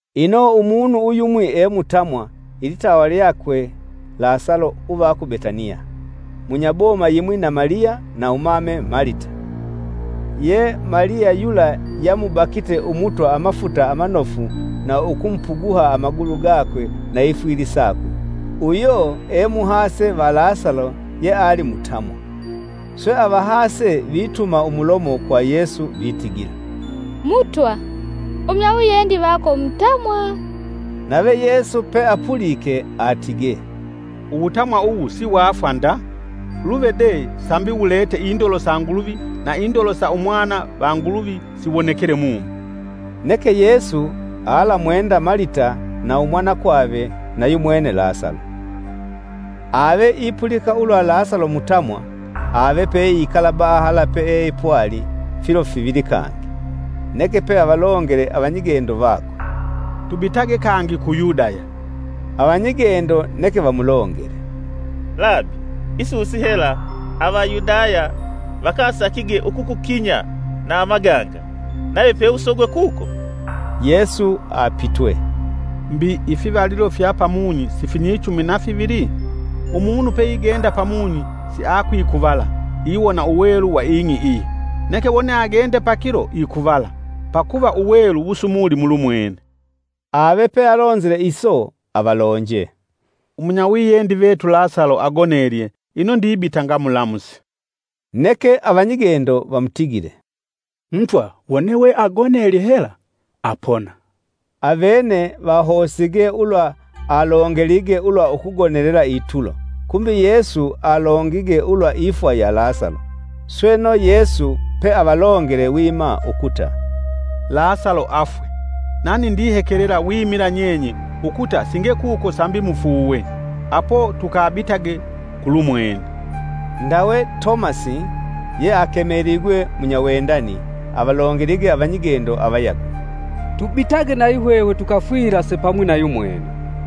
Ino Umunu uyumwi e mutamwa ilitawa lyakwe Lasalo uva ku Betaniya, (munya boma yimwi na Maliya na umame Malita. Ye Maliya yula yamubakite Umutwa amafuta amanofu na ukumupuguha amagulu gakwe na ifwili sakwe, uyo e muhase va Lasalo yeali mutamwa.) Swe avahase vituma umulomo kwa Yesu vitigila, “Mutwa umunyawiyendi vako mutamwa!” Nave Yesu peapulike atige, “Uwutamwa uwu si wafwa nda; luve de sambi wulete indolo sa Nguluvi na indolo sa umwana va Nguluvi siwonekele mumo.” Neke Yesu alamwenda Malita, na umwanakwave na yumwene Lasalo. Ave ipulika ulwa Lasalo mutamwa ave peikala bahala peepwali filo fivili kangi. Neke peavalongele avanyigendo vakwe, “Tubitage kangi ku Yudaya!” Avanyigendo neke vamulongele “Labi! isusi hela, Avayudaya vakasakige ukukukinya na amaganga, nave peusogwe kuko?” Yesu apitwe, “Mbi ifivalilo fya pamunyi sifinyichumi na fivili? Umunu peigenda pamunyi siakwikuvala, iwona uwelu wa ing'i iyi. Neke wone agende pakilo ikuvala, pakuva uwelu wusumuli mulumwene.” Ave pe alonzile iso avalonje, “Umunyawiyendi vetu Lasalo agonelye ino ndibita ngamulamuse.” Neke Avanyigendo vamutigile, “Mutwa wone we agonelye hela, apona.” Avene vahosige ulwa alongelige ulwa ukugonelela itulo, kumbi Yesu alongige ulwa ifwa ya Lasalo. Sweno Yesu pe avalongele wima ukuta, “Lasalo afwe; Nani ndihekelela wimila nyenye ukuta singekuko sambi mufuuwe. Apo tukabitage kulumwene.” Ndawe Tomasi (Yeakemeligwe munyawendani) avalongelige avanyigendo avayagwe, “Tubitage nayihwehwe tukafwilase pamwi na yumwene!”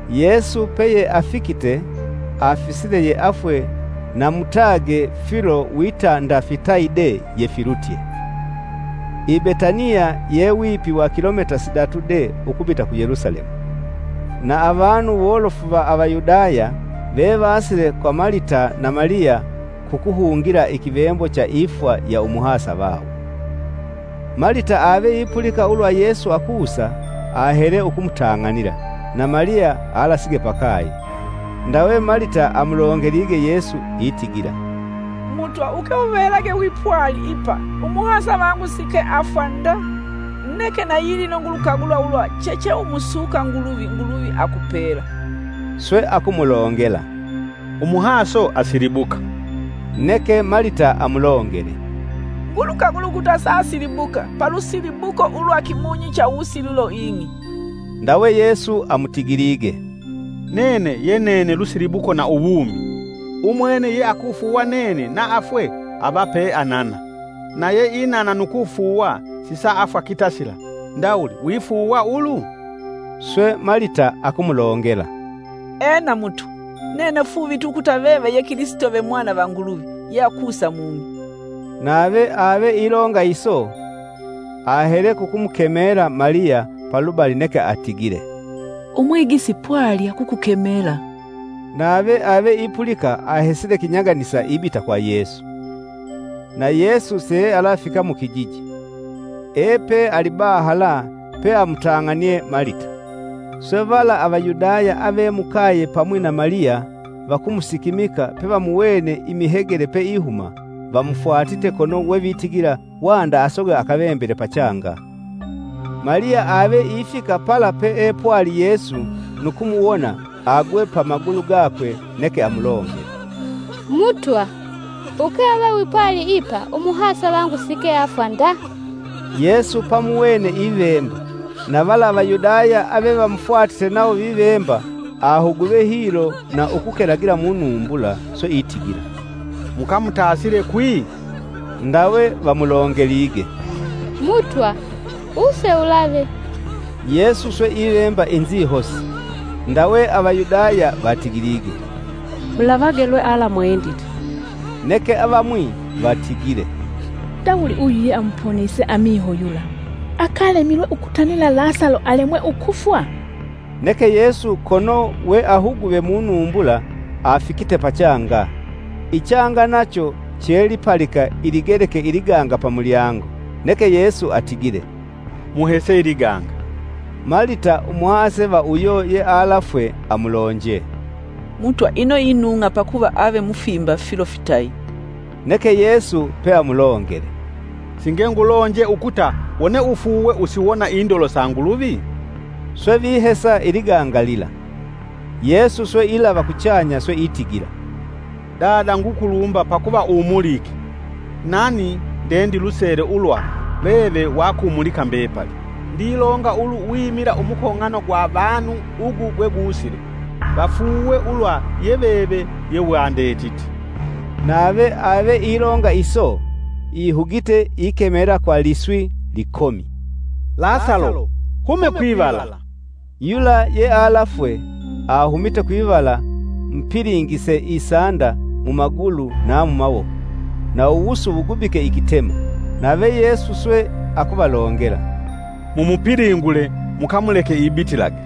Yesu peyeafikite, afisile yeafwe na mutage filo wita nda fitayi de yefilutye. I Betaniya ye wipi wa kilomita sidatu de ukubita ku Yelusalemu. Na avanu wolofu va Avayudaya vevasile kwa Malita na Maliya kukuhungila ikivembo cha ifwa ya umuhasa vawo. Malita aveipulika ulwa Yesu akusa, ahele ukumutang'anila; na Maliya alasige pakaye. Ndawe Malita amulongelige Yesu itigila, “Mutwa uke uvelage wipwali ipa umuhasa vangu sike afwa nda! Neke nayilino ngulukagula ulwa checheumusuka Nguluvi, Nguluvi akupela.” Swe akumulongela, “Umuhaso asilibuka.” Neke Malita amulongele, “Ngulukagula ukuta saasilibuka palusilibuko ulwa kimunyi cha uwusililo ing'i.” Ndawe Yesu amutigilige, “Nene ye nene lusilibuko na uwumi. Umwene yeakufuuwa nene na afwe ava pe anana na yeinana nu kufuuwa sisaafwa kitasila. Ndawuli wifuuwa ulu?” Swe Malita akumulongela, “Ena Mutwa! Nene fuuvitwe ukuta veve ye Kilisito ve Mwana va Nguluvi, yeakusa mung'i.” Nave ave ilonga iso ahele kukumukemela Maliya palubali neke atigile, “Umwigisi pwali akukukemela.” Nave ave ipulika ahesile kinyaganisa ibita kwa Yesu. Na Yesu siealafika mukijiji, epe alibahala peamutang'anie Malita. Swe vala Avayudaya ave mukaye pamwi na Maliya vakumusikimika pevamuwene imihegele peihuma, vamufwatite kono wevitigila wanda asogwe akavembele pachanga. Maliya ave ifika pala peepwali Yesu, nu kumuwona agwe pamagulu gakwe neke amulongele, “Mutwa, Uke uve wipwali ipa umuhasavangu sike afwa nda!” Yesu pamuwene ivemba, na vala Avayudaya avevamufwatite nawo vivemba; ahuguve hilo na ukukelagila munumbula. Swe itigila, “Mukamutasile kwi?” Ndawe vamulongelige, “Mutwa wuse ulave!” Yesu swe ivemba inzihosi. Ndawe Avayudaya vatigilige, “Mulavage lwealamwendite!” Neke avamwi vatigile, “Ndawuli uyu ye amuponise amiho yula, akalemilwe ukutanila Lasalo alemwe ukufwa?” Neke Yesu kono weahuguve munumbula afikite pachanga. Ichanga nacho che lipalika iligeleke iliganga pamulyango. Neke Yesu atigile, “Muhese iliganga” Malita, umuhase va uyo yealafwe amulonje, “Mutwa ino inung'a pakuva ave mufimba filo fitayi!” Neke Yesu peamulongele, “Singengulonje ukuta wone ufuuwe usiwona indolo sa Nguluvi?” Swe vihesa iliganga lila. Yesu swe ilava kuchanya swe itigila, “Dada ngukulumba pakuva umulike. Nani ndendilusele ulwa veve wakumulika mbepali, ndilonga ulu wimila umukong'ano gwa vanu ugu gwe gusile, vafuuwe ulwa ye veve ye wandetite.” Nave ave ilonga iso ihugite ikemela kwa liswi likomi, “Lasalo! hume kwivala!” Yula yealafwe ahumite kwivala mupilingise isanda mumagulu na mumawoko, na uwusu wugubike ikitema, nave Yesu swe akuvalongela, “Mumupilingule mukamuleke ibitilage.”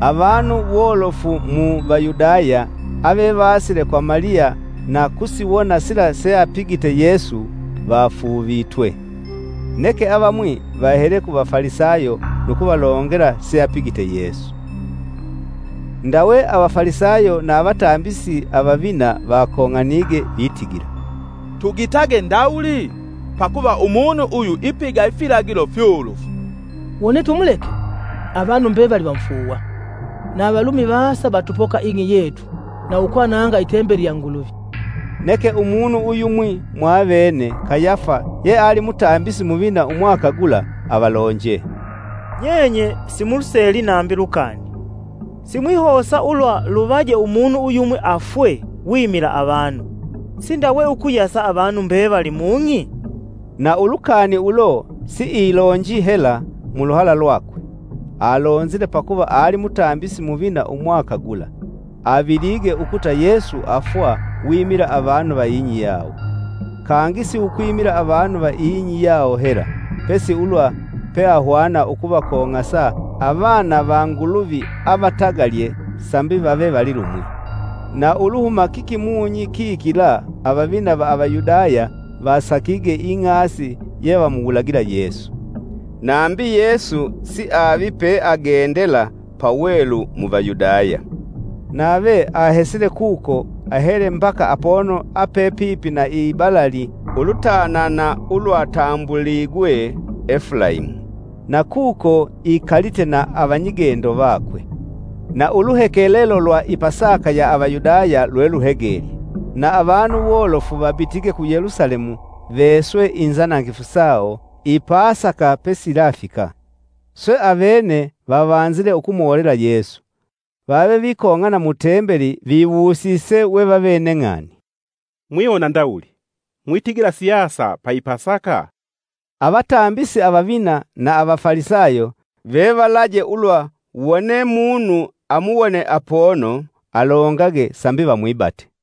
Avanu wolofu mu Vayudaya avevasile kwa Maliya na kusiwona sila seapigite Yesu vafuuvitwe. Neke avamwi vahele ku Vafalisayo nu kuvalongela seapigite Yesu. Ndawe Avafalisayo na avatambisi avavina vakong'anige vitigila, “Tugitage ndawuli? Pakuva umunu uyu ipiga ifilagilo fyolofu. Wone tumuleke, avanu mbevali vamufuuwa, na Avalumi vasa vatupoka ing'i yetu na ukwananga i tembeli ya Nguluvi!” Neke umunu uyumwi, mwa avene Kayafa yeali mutambisi muvina umwaka gula avalonje, “Nyenye simuluseli nambi lukani! Simwihosa ulwa luvaje umunu uyumwi afwe wimila avanu, sindawe ukuyasa avanu mbevali mung'i?” Na ulukani ulo siilonji hela muluhala lwakwe, alonzile pakuva ali mutambisi muvina umwaka gula, avilige ukuta Yesu afwa wimila avanu va ing'i yawo, kangi si ukwimila avanu va ing'i yawo hela, pesi ulwa peahwana ukuvakong'asa avana va Nguluvi avatagalye sambi vave valilumwi. Na Uluhuma kikimunyi kikila, avavina va Avayudaya vasakige ing'asi yevamuwulagila Yesu. Nambi Yesu siavi peagendela pawelu mu Vayudaya. Nave ahesile kuko ahele mbaka apono ape pipi na ibalali, ulutanana ulwatambuligwe Efulaimu, na kuko ikalite na avanyigendo vakwe. Na uluhekelelo lwa i pasaka ya Avayudaya lweluhegelye, na avanu wolofu vabitige ku Yelusalemu veswe inzanangifu sawo i pasaka pesiyilafika. Swe avene vavanzile ukumolela Yesu, vave vikong'ana mu tembeli viwusise we vavene ng'ani, “Mwiwona ndawuli? Mwitigila siasa lwa i Pasaka?” Avatambisi avavina na Avafalisayo vevalaje ulwa wone munu amuwone apono alongage sambi vamwibate.